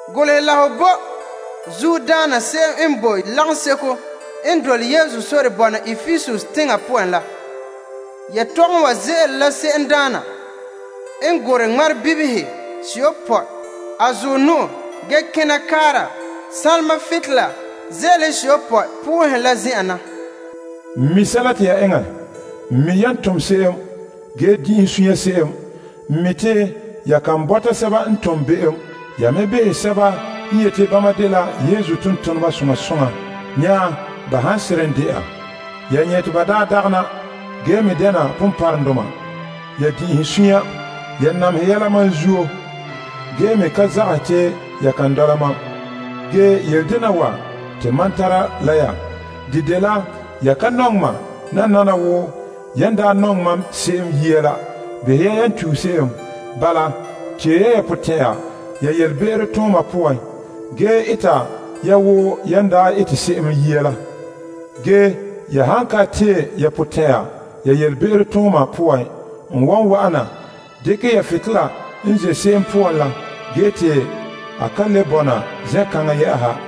Golehɛ la ho bo soŋora se'em n boe lagaŋseko n boe Epesus teŋa poan la. Yetɔgom wa ze'ele la se'emdaana n gorɛ ŋmarebibihe seyopɔe a zuɔ nu'o ge kena kaara sanlema butolela ze'elehe seyopɔe la. N mi sɛla te ya eŋɛ. N mi yan tom se'em ge din'inhe suunre se'em. N mi' te ya ka to'ohere sɛba n tone be'em. Ya me ne magahɛ sɛba n yeti bama dela Yesu tontoneba ge dagɛna la behɛ mɛ. Ya nyɛ' te ba dɛna la ponpɔrɔŋdoma. Ya din'inhe suunre. Ya namehɛ yɛla mam zuo ge me ka zagahɛ te ya kan dɔla mam. Ge yele dena wa te mam tara la ya. De dela ya ka nɔŋɛ mam nananawa wo yan daa nɔŋɛ mam se'em yia la. Behɛ ya yan tue se'em! Bala tee ya ya potɛn'ɛra ya yelebe'ero tooma poan gee ete ya wo yan daa ete se'em yia la. Ge ya han ka tee ya potɛn'ɛra ya yelebe'ero tooma poan, n wan wa'ana dekɛ ya butolela n ze' se'em poan la ge te a ka le bɔna zen'kaŋa yɛ'ɛha.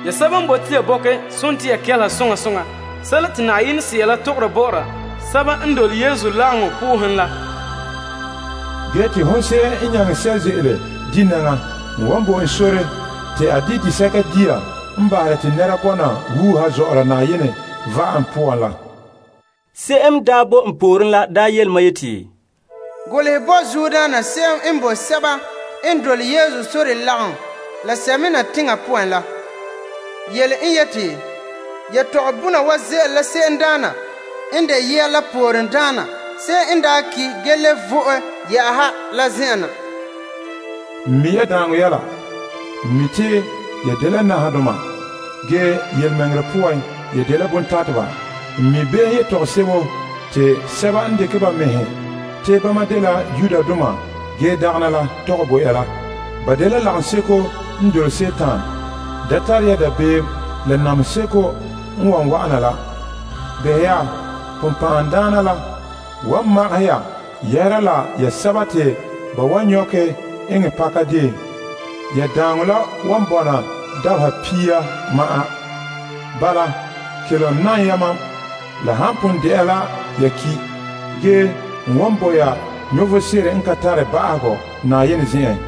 Se'em n tare toba a kelehe sɛla te Yenɛ Sea la tɔgɔra bɔ'ɔra lagaŋɔ la. Hon se'em n nyaŋɛ sɛ' ze'ele di' nɛŋa, n wan bo en sore te a di' vom tia la n boe Yenɛ va'am la poan la wɔla. Golehɛ bo soŋora la n boe lagaŋɔ seko n boe Smirna teŋa poan la. Yetɔgɔbɔna wa ze'ele la se'emdaana n daa ki' ge vo'e la zen'en na. N mi' ya daaŋɔ la. N mi' te ya dela nahadoma. Ge yelemɛŋɛrɛ poan, ya dela bontateba. N mi' be'em yetɔgom sebo te sɛba n dekɛ ba mɛhe te bama dela Yudoma ge dagɛna la tɔgɛ bo ya la. Ba dela lagaŋseko n dole Dima la. Da tare ya dabeem la namehe seko n wan wa'ana la. Behɛ ya, sagona la wan magahɛ ya yɛhera la ya sɛba te ba wan nyɔkɛ eŋɛ pakadeen. Ya daaŋɔ la wan bɔna dabeha pia ma'an. Bala, kelom nam ya mam la han pon de'a la ya ki', ge n wan bo ya vom sebo n ka tare ba'ahegɔ te la dɛna ya yɔɔrɛ.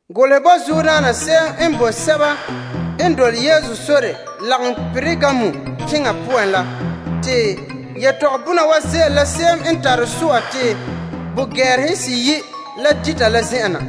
Golehɛ bo soŋora la n boe lagaŋɔ seko n boe Pergamum teŋa poan la. Yetɔgɔbɔna wa ze'ele la se'em n tare so'a la te ka gɛɛrehe seyi' la dita la zen'en na.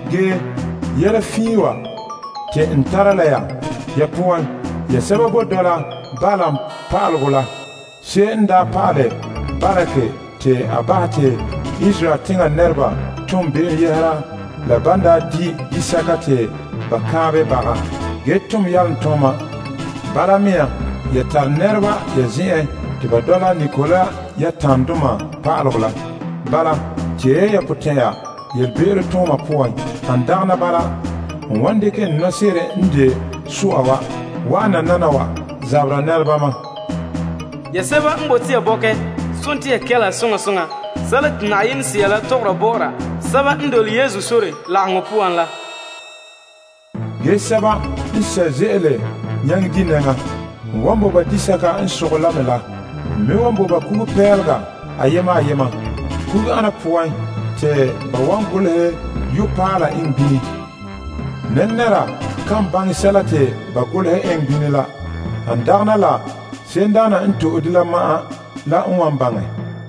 Ge yɛla fiin wa te n tara la ya. Ya poan, ya sɛba boe dɔla Balaam pa'alegɔ la. Se'em n daa pa'alɛ Balak te a bahɛ te Israel teŋa nɛreba ton be'em yɛhera la ban di' disɛka te ba kanbɛ baga, ge tom yalomtooma. Bala mea, te ya tare nɛreba ya zen'en te ba dɔla Nikolaitasdoma pa'alegɔ la. Bala, tee ya potɛn'ɛra ya yelebe'ero tooma poan. Han dagɛna bala, n wan dekɛ so'a la n ze'ele n nɔɔrɛn na la wa'an nananawa na zabɛ la nɛrebama. Se'em n tare toba a kelehe sɛla te Yenɛ Sea la tɔgɔra bɔ'ɔra lagaŋɔ la. Sɛba n nyaŋɛ n wan bo ba disɛka n sogɛ. N me wan bo ba ayena ayena kugupeela. Te ba wan golehɛ yu'urɛ paala eŋɛ bini. Nɛnɛra kan baŋɛ sɛla te ba golehɛ eŋɛ bini la han dagɛna la se'emdaana n to'e de ma'an la n wan baŋɛ.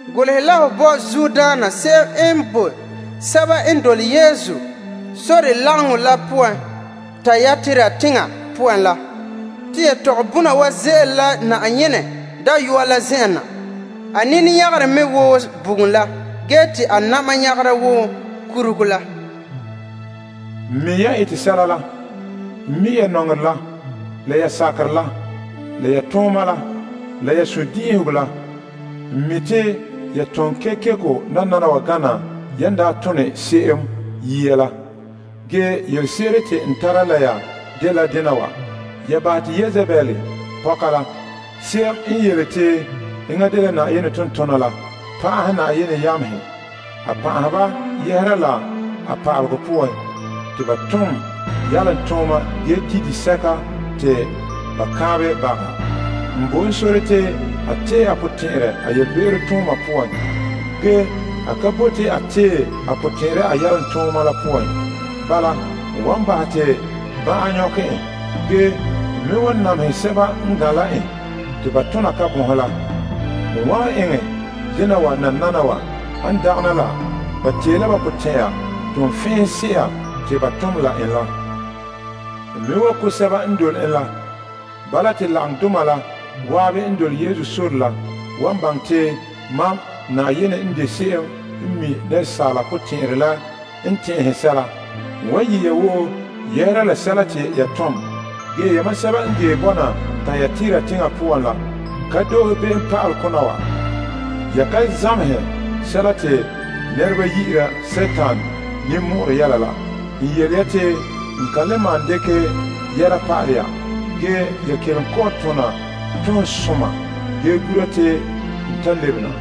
Golehɛ la ho bo soŋora se'em n boe lagaŋɔ la boe Tiatira teŋa poan la. Yetɔgɔbɔna wa ze'ele la Yenɛ Dayɔa la zen'en na. A nini nyagere mɛ wo bugum la ge te a na'ma nyagera wo nyɔgom te ba suuhe la bugum la. N mi' yan ete sɛla la. N mi' ya nɔŋerɛ la, la ya birikina la, la ya tooma la, la ya sundin'inhegɔ la. N mi' te ya tone kekeko nananawa gana yan daa tone se'em yia la. Yelese'ere te n tara la ya dela dena wa. Ya to'e Yezebel n de pɔka la, yi'ira a mɛŋa te enŋa dela Yenɛ tontona la, pan'ahɛ Yenɛ yamehe. A pan'ahɛ ba yɛhera la a pa'alegɔ poan, te ba tom yalomtooma ge dita baga dia. N bo en sore te a tee a potɛn'ɛrɛ a be'em poan. Ge a ka bote a tee a potɛn'ɛrɛ a yalomtooma la poan. Bala, n wan bahɛ te ban'an nyɔkɛ en. Ge n me wan namehɛ sɛba n gan' la en te ba tona kabonhe la. N wan eŋɛ dena wa nananawa, han dagɛna la ba tee la ba potɛn'ɛra toonfɛn'ɛha se'a te ba tom la en la. N me wan ko' sɛba n dole en la, te lagaŋɔ la woo baŋɛ, te mam de se'em n mi' asaala potɛn'ɛrɛ la n tɛn'ɛhɛ sɛla. N wan yɛ' ya woo yɛhera la sɛla te ya tom. Yamam sɛba n boe Tayatira teŋa poan la, ka doohe be'em pa'ale kona wa. Ya ka zamehɛ sɛla te nɛreba yi'ira Dima ninmɔ'ɔrɛ yɛla la. N yele ya te n kan dekɛ yɛla pa'ahɛ ya. Ge ya kelom kɔ'ɔn tona toonsoma ge gura te n ta lebe na.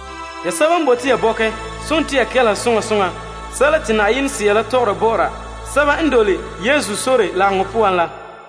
Se'em n tare toba a kelehe sɛla te Yenɛ Sea tɔgɔra bɔ'ɔra lagaŋɔ la.